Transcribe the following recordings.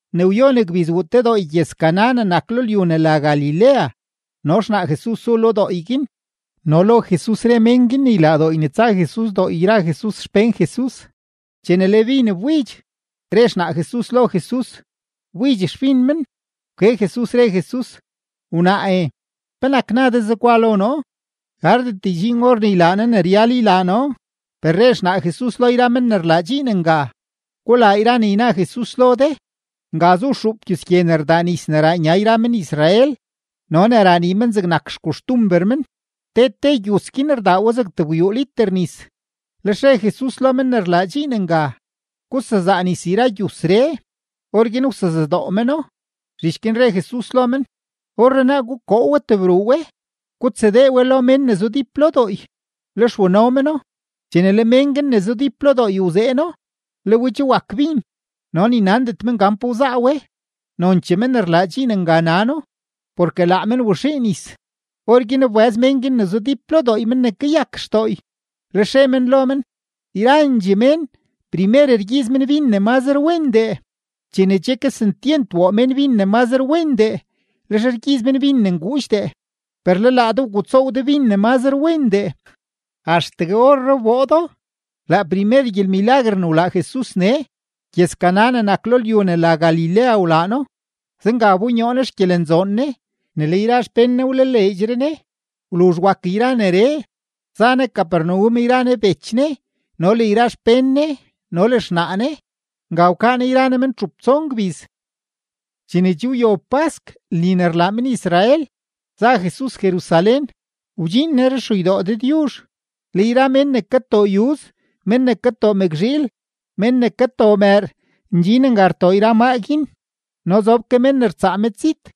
Ne wyon gbiz wuu te dooy gyëz-Caná ne nak lo lyu ne la Galilea no xnaa Jesus zu lo dooy guin, no lo Jesus re mén guin ne ylaa dooy ne tsa Jesus dooy yra Jesus xpén Jesus. Chene le bin wbidx, re xnaa Jesus lo Jesus: ―Wbidx xbin men. Wke Jesus, re Jesus: ―Wnaae, ¿penak na de zegwa lo noo? Gardet ydxiin or ne ylaa noo ne ryal ylaa noo. Per re xnaa Jesus lo yra men ne rlaa dxiin nga: ―Gulaa yra ne yna Jesus lo de. Nga zu xuup gyus gye ne rdaa nis ne raa nya yra men-Israel no ne raa nii men, zegnak xkoxtumber men. Te te gyus guin rdaa we zeg tebgwyuu liter nis. Lex re Jesus lo men ne rlaa dxiin nga: ―Gusezaa nis yra gyusree. Orguin wsezadoo meno. Zhich guin re Jesus lo men: ―Orrenaa gukoo we tebruu we, gutsadee we lo mén ne zudíp lo dooy. Lex wano meno. Chene le mén guin ne zudíp lo dooy wzeeno, le we che wak bin, no ni nandet men pa wzaa we. Nonchee men ne rlaa dxiin nga nano, porke laa men waxii nis. Orguin wbëz mén guin ne zudíp lo dooy men ne kayak xdooy, lex re men lo men: ―Yrandxee mén, primer rgyiiz men bin ne mazre wendee; chene che kesentyent woo mén bin ne mazre wendee, lex rgyiiz men bin ne nguudxdee. Per le laa de wgutsoow de bin ne mazre wendee, axtegue orree wboo do. Laa primer gyelmilaguer ne wlaa Jesus nee, gyëz-Caná ne nak lo lyu ne la Galilea wlaa No. Zenga wbonyoo Ne xgyelenzoon Ne, ne le yra xpén Ne wlaleedxre Ne. Wluzh wak neree, za Ne Capernaum yra Ne bech Ne, no le yra xpén Ne, no le xnaa Ne. Nga wkaa Ne yra Ne men txup tson gbiz. Chene che wyob pask lni ne rlaa men-Israel, za Jesus Jerusalén. Wdxiin Ne ruxeydoo Dëdyuzh, le yra mén ne katoo yuz, mén ne katoo mëkzhiil, mén ne katoo mëër, ndxin nga rtoo yra maa guin, no zob ke mén ne rtsaa medzit.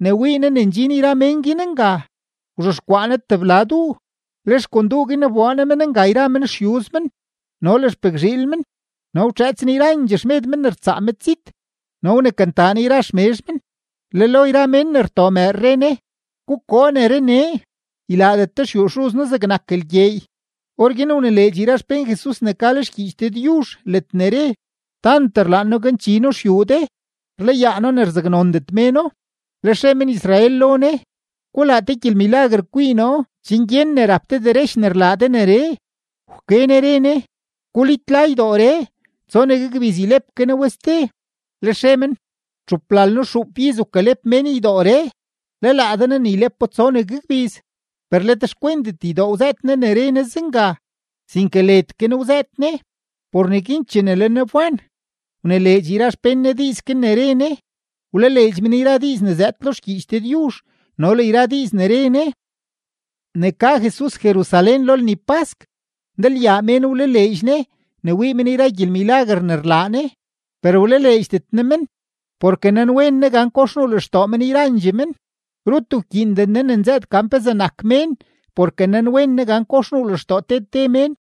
Ne wii Ne ne ndxin yra mén guin nga, wzhexkwaa Ne tebla duu, lex kon duu guin wboo Ne men nga yra men xyuz men no le xpëkzhiil men, no wtxëëts Ne yrandxee xmed mén ne rtsaa medzit, no wnekantaa Ne yra xmezh men, le lo yra mén ne rtoo mëër re Ne: ―¡Gukoo neree nee! ¡Ylaadet de xyuu Xuz noo zegnak lgyeey! Orguin wnileedx yra xpén Jesus ne ka lo xgyiich Dëdyuzh ledne re: “Tant rlaan noo ganchi noo xyuu de, rlayaa noo ne rzaknondet méno.” Lex re men-Israel lo Ne: ―Gulaa te gyelmilaguer kwii noo chen gyen ne rap de derech ne rlaa de neree. Wke Ne re Ne: ―Gulitla ydooree, tsonegue gbiz ylep ke noo we ste. Lex re men: ―Txuplalno-xuup iz wkalep mén ydooree. ¿Le laa de naa ne ylepo tsonegue gbiz? Per let xkwentet ydoo wzëët Ne ne re Ne zenga, sinke led ke Ne wzëët Ne. Por neguin, chene le Ne wban, wnileedx yra xpén Ne diiz guin ne re Ne, wlaleedx men yra diiz ne zëëd lo xgyiich Dëdyuzh no le yra diiz ne re Ne. Ne ka Jesus Jerusalén lo lni pask, ndalyaa mén wlaleedx Ne ne wii men yra gyelmilaguer ne rlaa Ne. Per wlaleedxdet Ne men, porke nanwen Ne gan kox nuu lextoo men yrandxee men. Rut wkyiinden Ne ne nzëët gan pezee nak mén porke nanwen Ne gan kox nuu lextoo te te mén.